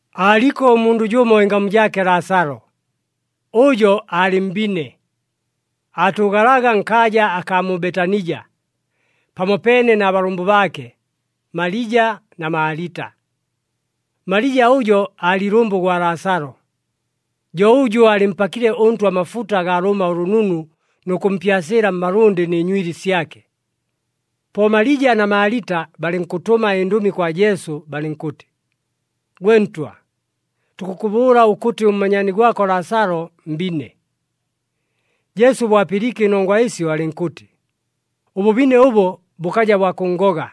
Aaliko ʉmundʉ jʉmo ɨngamu jaake Laasalo. Ʉjo aalɨ mbine. Aatʉʉgalaga nkaaja akaa mu Betanija pamopeene na balʉmbʉ baake, Malija na Maalita. Malija ʉjo aalɨ ilʉmbʉ gwa Laasalo, jo ʉjʉ aalɨmpakile ʉNtwa amafuta agaa lʉʉma ʉlʉnunu nʉ kʉmpyasɨɨla mmalʉndɨ nɨ nywili syake. Po Malija na Maalita balɨnkʉtʉma ɨndʉmi kwa Jesu balɨnkʉtɨ, “Gwe Ntwa, tukʉkʉbʉʉla ʉkʉtɨ ʉmmanyaani gwako Laasalo mbine.” Jesu bo apɨliike ɨnongwa ɨsyo alɨnkʉtɨ, “Ʉbʉbine ʉbo bʉkaja bwa kʉnngoga,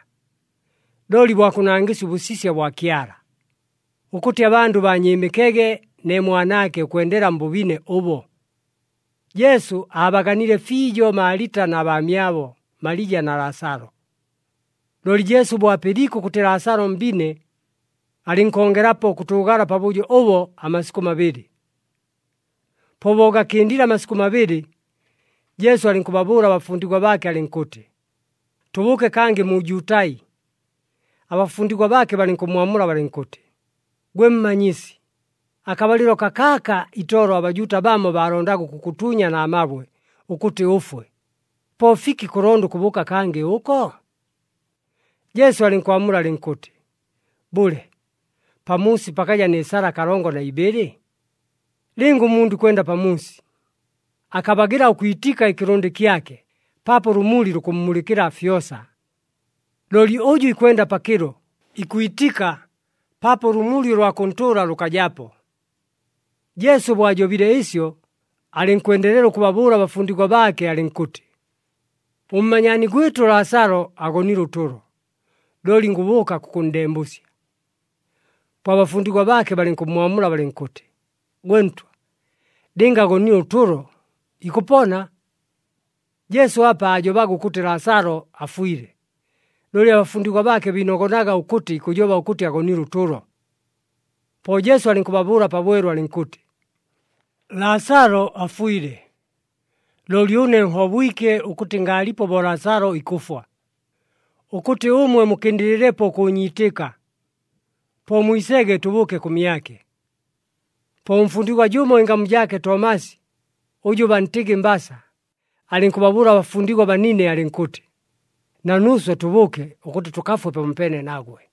looli bwa kʉnangɨsya ʉbʉsisya bwa Kyala, ʉkʉtɨ abandʉ baanyɨɨmɨkege ne Mwanaake ʉkwendela mbʉbine ʉbo.” Jesu aabaganile fiijo Maalita na baamyabo Malija na Laasalo. Looli Jesu bo apɨliike ʉkʉtɨ Laasalo mbine, alɨnkongelapo ʉkʉtʉʉgala pabʉjo ʉbo amasikʉ mabɨlɨ. Po bo gakɨndile amasikʉ mabɨlɨ, Jesu alɨnkʉbabʉʉla abafundigwa baake alɨnkʉtɨ, “Tʉbʉʉke kangɨ mu Jutai.” Abafundigwa baake balɨnkʉmmwamula balɨnkʉtɨ, “Gwe Mmanyisi, akabalɨlo kakaaka itolo aBajuuta bamo baalondaga ʉkʉkʉtuunya na mabwe ʉkʉtɨ ʉfwe. Po fiki kʉlonda ʉkʉbʉʉka kangɨ ʉko?” Jesu alɨnkwamula alɨnkʉtɨ, “Bʉle, pamuusi pakaja nɨ sala kalongo na ibɨlɨ? Lɨnga ʉmundʉ ikwenda pamuusi, akabagɨla ʉkwitika ɨkɨlʉndɨ kyake paapo ʉlʉmuli lukʉmmulɨkɨla fyosa. Looli ʉjʉ ikwenda pakɨlo, ikwitika paapo ʉlʉmuli ʉlwa kʉntʉʉla lʉkajapo.” Jesu bo ajobile ɨsyo, alɨnkwendelela ʉkʉbabʉʉla abafundigwa baake alɨnkʉtɨ, “Ʉmmanyaani gwɨtʉ Laasalo agonile ʉtʉlo, looli ngʉbʉʉka kʉkʉnndembʉsya.” Po abafundigwa baake balɨnkʉmmwamula balɨnkʉtɨ, “Gwe Ntwa, lɨnga agonile ʉtʉlo, ikʉpona.” Jesu apa aajobaga ʉkʉtɨ Laasalo afwile, looli abafundigwa baake biinogonaga ʉkʉtɨ ikʉjoba ʉkʉtɨ agonile ʉtʉlo. Po Jesu alɨnkʉbabʉʉla pabwelu alɨnkʉtɨ, “Laasalo afwile. Looli ʉne nhobwike ʉkʉtɨ ngaalipo bo Laasalo ikʉfwa, ʉkʉtɨ ʉmwe mukɨndɨlɨlepo ʉkʉʉnyiitɨka. Po mwisege tʉbʉʉke kʉmyake.” Po ʉmfundigwa jʉmo ɨngamu jaake Tomasi ʉjʉ bantɨgɨ Mbasa, alɨnkʉbabʉʉla abafundigwa abanine alɨnkʉtɨ, “Na nuuswe tʉbʉʉke, ʉkʉtɨ tʉkafwe pamopeene nagwe.”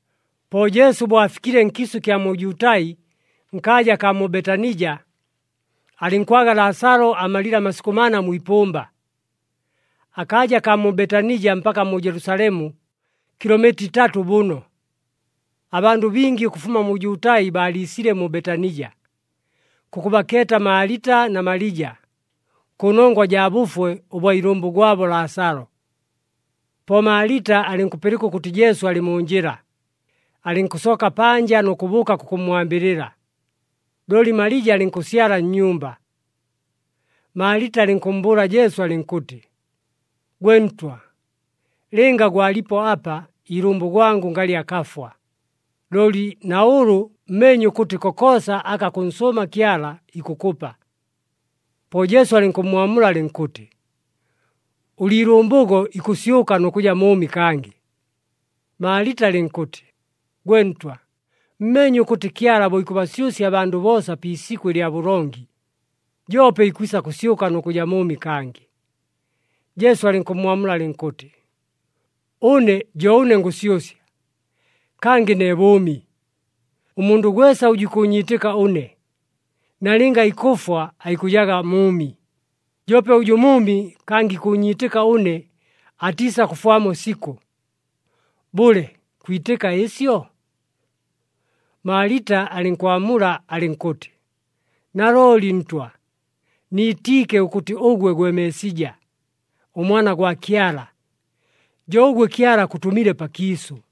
Po Jesu bo afikile nkiisʉ ɨkya mu Jutai nkaaja akaa mu Betanija, alɨnkwaga Laasalo amalile amasikʉ mana mwi ipʉmba. Akaaja kaa mu Betanija mpaka mu Jelusalemu kilomita itatʉ bʉno. Abandʉ bingi ʉkʉfuma mu Jutai baaliisile mu Betanija kʉkʉbakeeta Maalita na Malija, kʉnongwa jaa bʉfwe ʉbwa ilʉmbʉ gwabo Laasalo. Po Maalita alɨnkʉpɨlɨka ʉkʉtɨ Jesu alɨ mu njɨla, alɨnkʉsooka panja nʉ kʉbʉʉka kʉkʉmmwambɨlɨla, looli Malija alɨnkʉsyala nnyumba. Maalita alɨnkʉmmbʉʉla Jesu alɨnkʉtɨ, “Gwe Ntwa, lɨnga gwalipo apa, iilʉmbʉ gwangʉ ngalɨ akafwa. Looli na ʉlʉ mmeenye ʉkʉtɨ kokoosa aka kʉnsʉʉma Kyala ikʉkʉpa.” Po Jesu alɨnkʉmmwamula alɨnkʉtɨ, “Ʉliilʉmbʉgo ikʉsyʉka nʉ kʉja mʉʉmi kangɨ.” Maalita alɨnkʉtɨ, “Gwe Ntwa, mmeenye ʉkʉtɨ Kyala bo ikʉbasyʉsya abandʉ boosa pi isikʉ lya bʉlongi, joope ikwisa kʉsyʉka nʉ kʉja mʉʉmi kangɨ.” Jesu alɨnkʉmmwamula alɨnkʉtɨ, “Ʉne jo ʉne ngʉsyʉsya, kangɨ ne bʉʉmi. Ʉmundʉ gwesa ʉjʉ ikʉʉnyiitɨka ʉne, nalɨnga ikʉfwa aikʉjaga mʉʉmi. Joope ʉjʉ mʉʉmi, kangɨ ikʉʉnyiitɨka ʉne atiisakʉfwamo sikʉ. Bʉle, kwitɨka ɨsyo?” Maalita alɨnkwamula alɨnkʉtɨ, “Nalooli Ntwa, niitiike ʉkʉtɨ ʉgwe gwe Meesija, ʉMwana gwa Kyala, jo ʉgwe Kyala akʉtʉmile pakiisʉ.”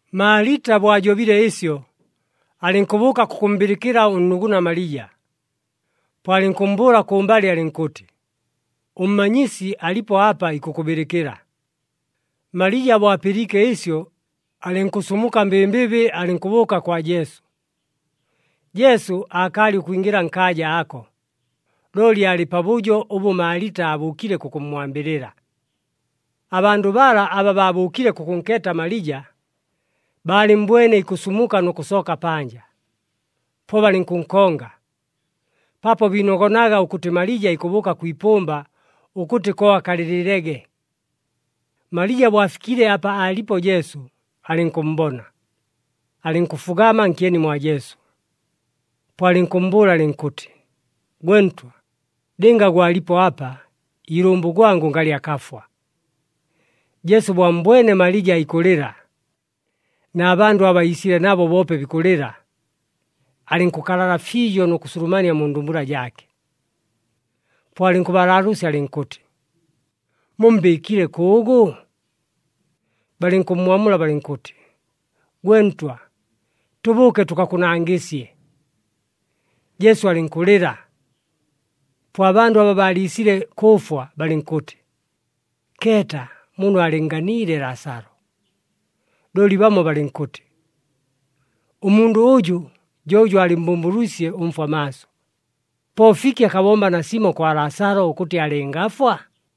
Maalita bo ajobile ɨsyo, alɨnkʉbʉʉka kʉkʉmmbɨlɨkɨla ʉnnuguna Malija. Po alɨnkʉmmbʉʉla kʉmbalɨ alɨnkʉtɨ, “ɄMmanyisi alipo apa, ikʉkʉbɨlɨkɨla.” Malija bo apɨliike ɨsyo, alɨnkʉsumuka mbɨmbɨbɨ alɨnkʉbʉʉka kwa Jesu. Jesu aakaalɨ ʉkwingɨla nkaaja ako, looli aalɨ pabʉjo ʉbʉ Maalita aabʉʉkile kʉkʉmmwambɨlɨla. Abandʉ bala aba baabʉʉkile kʉkʉnkeeta Malija, baalɨmmbwene ikʉsumuka nʉ kʉsooka panja. Po balɨnkʉnkonga, paapo biinogonaga ʉkʉtɨ Malija ikʉbʉʉka kwi ipʉmba ʉkʉtɨ ko akalɨlɨlege. Malija bo afikile apa aalipo Jesu, alɨnkʉmmbona, alɨnkʉfugama nkyeni mwa Jesu, po alɨnkʉmmbʉʉla alɨnkʉtɨ, “Gwe Ntwa, lɨnga gwalipo apa, iilʉmbʉ gwangʉ ngalɨ akafwa.” Jesu bo ammbwene Malija ikʉlɨla, na bandʉ aba iisile nabo boope bikʉlɨla, alɨnkʉkalala fiijo nʉ kʉsulumania mu ndumbula jaake. Po alɨnkʉbalaalʉʉsya alɨnkʉtɨ, “Mummbɨɨkile kʉʉgʉ?” Balɨnkʉmmwamula balɨnkʉtɨ, “Gwe Ntwa, tʉbʉʉke tʉkakʉnangɨsye.” Jesu alɨnkʉlɨla. Po abandʉ aba baaliisile kʉʉfwa balɨnkʉtɨ, “Keeta muno aalɨnnganiile Laasalo!” Looli bamo balɨnkʉtɨ, “Ʉmundʉ ʉjʉ jo ʉjʉ aalɨmmbʉmbʉlwisye ʉmfwa maaso. Po fiki akabomba nasimo kwa Laasalo, ʉkʉtɨ alɨngafwa?”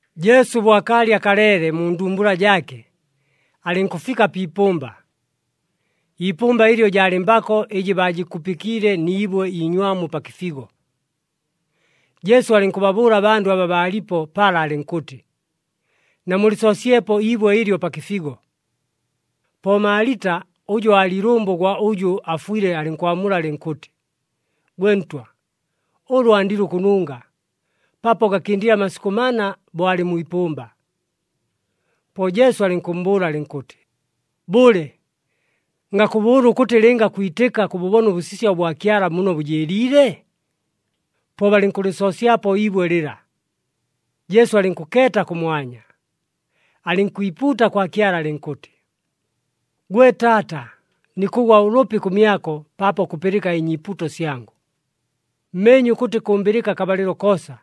Jesu bo akaalɨ akaleele mu ndumbula jaake, alɨnkʉfika pi ipʉmba. Iipʉmba ɨlyo jaalɨ mbako ɨjɨ baajɨkupɨkiile ni ibwe iinywamu pa kɨfigo. Jesu alɨnkʉbabʉʉla abandʉ aba baalipo pala alɨnkʉtɨ, “Namulɨsoosyepo iibwe ɨlyo pa kɨfigo.” Po Maalita ʉjʉ aalɨ ilʉmbʉ ʉgwa ʉjʉ afwile alɨnkwamula alɨnkʉtɨ, “Gwe Ntwa, ʉlʉ andile ʉkʉnunga, paapo gakɨndile amasikʉ mana bo alɨ mwi ipʉmba.” Po Jesu alɨnkʉmmbʉʉla alɨnkʉtɨ, “Bʉle, ngakʉbʉʉla ʉkʉtɨ lɨnga kwitɨka, kʉbʉbona ʉbʉsisya ʉbwa Kyala muno bʉjɨɨliile?” Po balɨnkʉlɨsoosyapo iibwe lɨla. Jesu alɨnkʉkeeta kʉmwanya, alɨnkwipuuta kwa Kyala alɨnkʉtɨ, “Gwe Taata, nikʉgwa ʉlʉpi kʉmyako paapo kʉpɨlɨka ɨnyiipuuto syangʉ. Mmeenye ʉkʉtɨ kʉmbɨlɨka akabalɨlo koosa,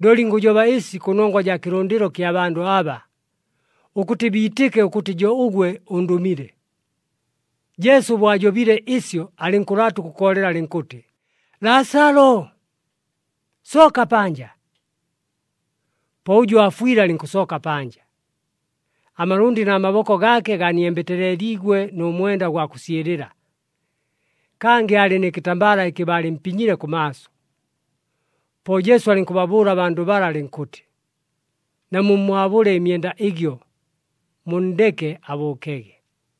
looli ngʉjoba ɨsi kʉnongwa jaa kɨlʉndɨlo kya bandʉ aba, ʉkʉtɨ biitɨke ʉkʉtɨ jo ʉgwe ʉndʉmile.” Jesu bo ajobile ɨsyo alɨnkʉlaata ʉkʉkoolela alɨnkʉtɨ, “Laasalo, sooka panja!” Po ʉjʉ aafwile alɨnkʉsooka panja. Amalʉndɨ na maboko gaake ganiembeteeleliigwe nʉ mwenda ʉgwa kʉsyɨlɨla. Kangɨ aalɨ nɨ kɨtambala ɨkɨ baalɨmpinyile kʉmaaso. Po Jesu alɨnkʉbabʉʉla abandʉ bala alɨnkʉtɨ, “Namummwabʉle ɨmyenda ɨgyo, munndeke abʉʉkege.”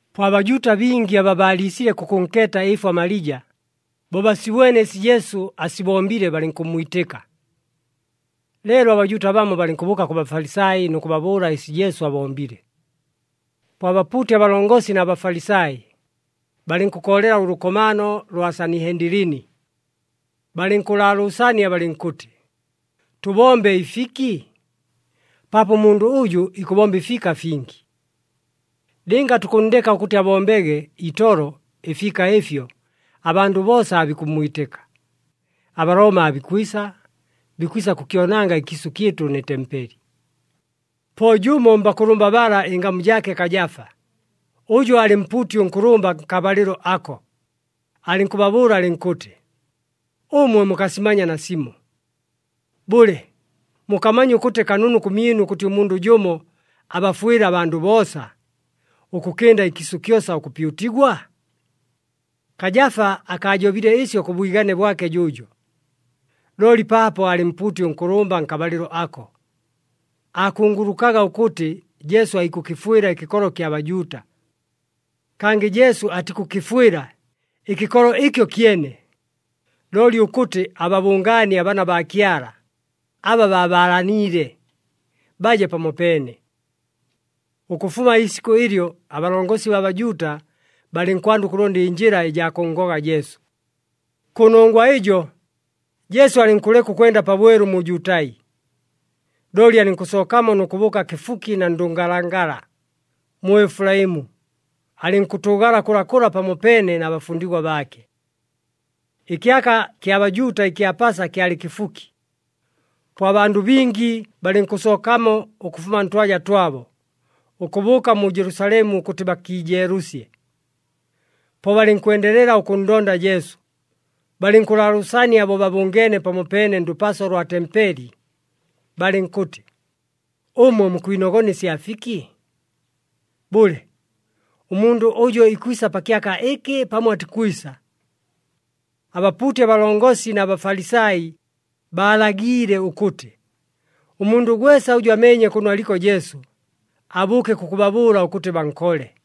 Po aBajuuta bingi aba baaliisile kʉkʉnkeeta ɨɨfwa Malija, bo basibwene ɨsi Jesu asibombile, balɨnkʉmmwitɨka. Leelo aBajuuta bamo balɨnkʉbʉʉka kʉ Bafalisai nʉ kʉbabʉʉla ɨsi Jesu abombile. Po abapuuti abalongosi na Bafalisai balɨnkʉkoolela ʉlʉkomaano lwa Sanihendilini, balɨnkʉlaalʉʉsania balɨnkʉtɨ, “Tʉbombe ɨfiki? Paapo ʉmundʉ ʉjʉ ikʉbomba ɨfiika fingi. Lɨnga tukʉnndeka ʉkʉtɨ abombege itolo ɨfiika ɨfyo, abandʉ boosa aabikʉmmwitɨka. ABalooma aabikwisa, bikwisa kʉkyonanga ɨkiisʉ kyɨtʉ nɨ tempeli.” Po jʉmo mbakʉlʉmba bala ɨngamu jaake Kajafa, ʉjʉ aalɨ mpuuti ʉnkʉlʉmba nkabalɨlo ako, alɨnkʉbabʉʉla alɨnkʉtɨ, “Ʉmwe mukasimanya nasimo!” Bʉle, mukamanya ʉkʉtɨ kanunu kʉmyɨnu ʉkʉtɨ ʉmundʉ jʉmo abafwɨle abandʉ boosa, ʉkʉkɨnda ɨkiisʉ kyosa ʉkʉpyutigwa? Kajafa akaajobile ɨsyo kʉ bwigane bwake jʉʉjo. Looli paapo aalɨ mpuuti ʉnkʉlʉmba nkabalɨlo ako, aakungulukaga ʉkʉtɨ Jesu aikʉkɨfwɨla ɨkɨkolo kya Bajuuta. Kangɨ Jesu atikʉkɨfwɨla ɨkɨkolo ɨkyo kyene, looli ʉkʉtɨ ababʉngaanie abaana baa Kyala aba baabalaniile, baje pamopeene. Ʉkʉfuma iisikʉ ɨlyo, abalongosi baa Bajuuta balɨnkwanda ʉkʉlonda ɨnjɨla ɨjaa kʉnngoga Jesu. Kʉnongwa ɨjo, Jesu alɨnkʉleka ʉkwenda pabwelu mu Jutai. Looli alɨnkʉsookamo nʉ kʉbʉʉka kɨfuki na ndʉngalangala, mu Efulaimu, alɨnkʉtʉʉgala kʉlakʉla pamopeene na bafundigwa baake. Ɨkyaka kya Bajuuta ɨkya Pasa kyalɨ kɨfuki. Po abandʉ bingi balɨnkʉsookamo ʉkʉfuma ntwaja twabo, ʉkʉbʉʉka mu Jelusalemu ʉkʉtɨ bakiijeelʉsye. Po balɨnkwendelela ʉkʉnndonda Jesu, balɨnkʉlaalʉʉsania bo babʉngeene pamopeene ndʉpaso lwa tempeli, balɨnkʉtɨ, “Ʉmwe mukwinogona ɨsya fiki? Bʉle, ʉmundʉ ʉjo ikwisa pa kyaka ɨkɨ pamo atikwisa?” Abapuuti abalongosi na Bafalisai baalagiile ʉkʉtɨ, ʉmundʉ gwesa ʉjʉ ameenye kʉno aliko Jesu, abʉʉke kʉkʉbabʉʉla ʉkʉtɨ bankole.